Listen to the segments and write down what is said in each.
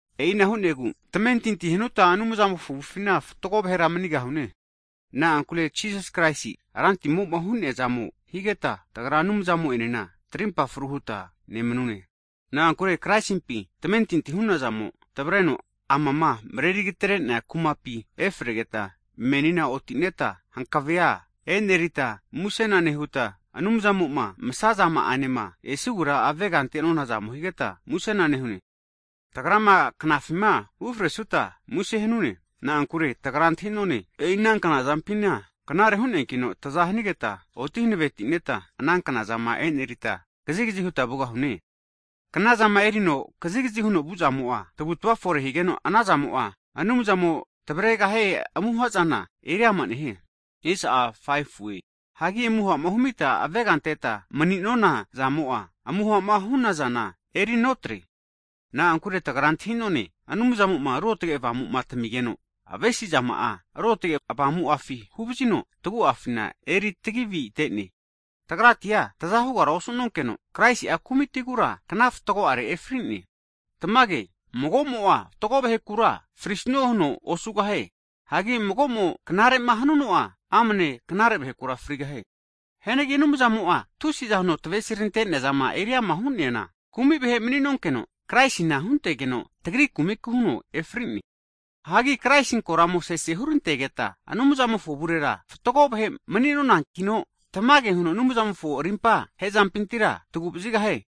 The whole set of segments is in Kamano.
E'ina hu'negu tamentinti hanuta Anumzamofo avufina fatgo vahera manigahune. Na'ankure Jisasi Kraisi Rantimoma hu'nea zamo higeta, tagra Anumzamo'enena trimpa fru huta nemanune. Na'ankure Kraisimpi tamentinti hu'nazamo tavreno amama mreri agatere'nea kumapi efregeta menina otineta, hankavea e'nereta, Anumzamo'ma msazama'anema esigura avega ante'nonazamo higeta musena nehune. Tagrama knafima ufresuta muse hanune. Na'ankure tagra antahi'none, e'i ana knazampina knare hu'neankino taza hanigeta oti hanavetineta ana knazama enerita kazigazi huta vugahune. Knazama erino kazigazi huno vu'zamo'a tavutava fore higeno, ana zamo'a Anumzamo tavregahie amuhazana eriama nehie. Hagi amuhama humita avega anteta mani'nona zamo'a, amuhama hu'nazana erinotre. Na'ankure tagra antahi'none Anumzamo'ma Ruotge Avamu tamigeno, avesizama'a Ruotge Avamu'afi huvazino tagu'afi eritagi avinete. Tagrati'a taza hugara osu'nonkeno, Kraisi'a kumitigura kna fatgo'are efri'ne. Tamage mago'mo'a fatgo vahekura frisnue huno osugahie. Hagi mago'mo knare'ma hanuno'a, amne knare vahekura frigahie. Hianagi Anumzamo'a tusiza huno avesirantenea zama eriama hu'neana, kumi vahe mani'nonkeno Kraisina huntegeno, tagri kumiku huno efri'ne. Hagi Kraisi koramo sese hurantegeta, Anumzamofo avurera fatgo vahe mani nonankino, tamage huno Anumzamofo rimpa hezampintira tavu'vazigahie.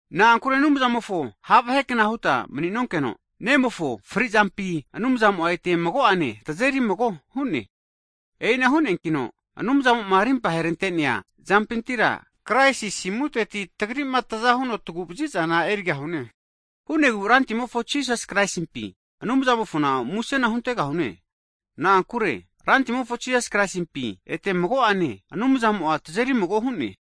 Na'ankure Anumzamofo ha' vahekna huta mni'nonkeno, Nemofo frizampi Anumzamo ete mago'ane tazeri mago hu'ne. E'ina hu'neankino Anumzamo'ma rimpa herante'nea zampintira Kraisi asimuteti, tagri'ma taza huno tagu'vazizana erigahune. Hu'negu Rantimofo Jisasi Kraisimpi Anumzamofona musena huntegahune. Na'ankure Rantimofo Jisas Kraisimpi ete mago'ane, Anumzamo'a tazeri mago hu'ne.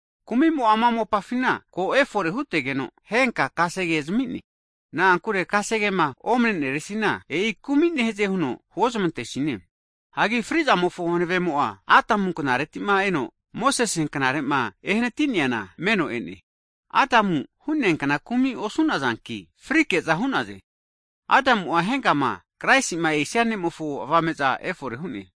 Kumimo'a ama mopafina ko efore hutegeno, henka kasegea zamine. Na'ankure kasegema omneneresina, e'i kumi nehaze huno huozmantesine. Hianagi fri'zamofo hanavemo'a Adamu knaretima eno Mosese knarema ehanati'neana meno e'ne. Adamu hu'neakna kumi osu'nazanki, frike'za hu'naze. Adamu'a henkama Kraisima esia Ne'mofo avame'za efore hu'ne.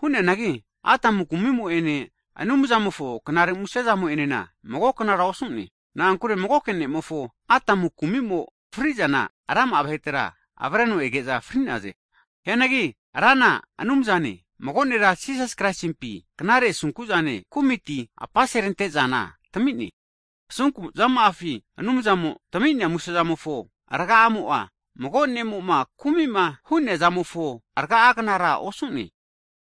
Hu'neanagi Adamu kumimo'ene, Anumzamofo knare musezamo'enena magoknara osu'ne. Na'ankure magoke ne'mofo Adamu kumimo frizana rama'a vahetera avareno ege'za fri'naze. Hianagi Rana Anumzane, mago nera Jisas Kraisimpi knare asunkuzane kumiti apase atrerante zana tamine. Asunkuzama'afi Anumzamo tami'nea musezamofo raga'amo'a mago ne'mo'ma kumi'ma hu'nea zamofo raga'agnara osu'ne.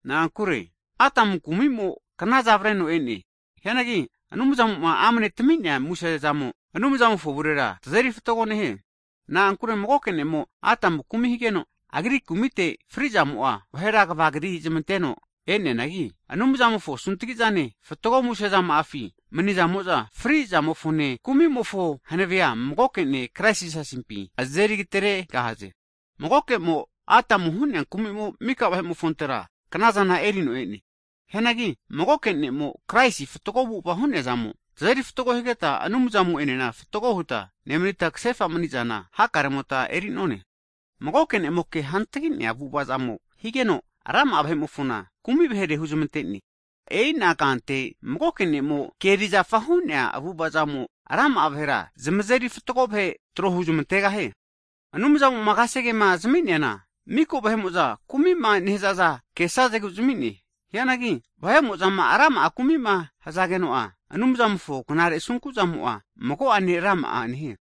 Na'ankure Adamu kumimo knaza avareno e'ne. Hianagi Anumzamo'ma amne tami'mea musezamo, Anumzamofo avurera tazeri agru hune. Na'ankure magoke ne'mo Adamu kumi higeno, agri kumite fri zamo'a vahera kva'gri zamanteno e'neanagi, Anumzamofo asuntgi'zane fatgo musezama'afi manisamo'za fri zamofone kumimofo hanavea magoke Ne' Kraisi Jisasimpi azeri ageteregahaze. Magokemo Adamu hu'nea kumimo maka vahe'mofontera knazana erino e'ne. Hianagi magoke ne'mo Kraisi fatgo avu'ava hu'neazamo tazeri agru higeta, Anumzamo'enena fatgo huta nemanita, kasefa manizana hakaremota eri'none. Magoke ne'mo ke hantagi'nea avu'avazamo higeno, rama'a vahe'mofona kumi vahere huzmante'ne. E'ina kante magoke Ne'mo ke erizafa hu'nea avu'ava'zamo rama'a vahera zmazeri fatgo vahe tro huzmantegahie. Anumzamoma kasegema zami'neana miko vahe'mo'za kumima nehazaza kesazegu zamine. Hianagi vahe'mo'zama rama'a kumima hzageno'a, Anumzamofo knare asunku'zamo'a mago'ane rama'a nehie.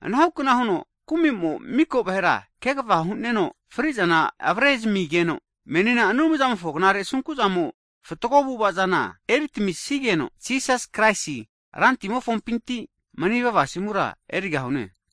Ana hukna huno kumimo miko vahera kegva hu'neno fri'zana avrezamigeno, menina Anumzamofo knare asunku'zamo fatgo avu'avazana eritamisigeno, Jisas Kraisi Rantimofompinti manivava asimura erigahune.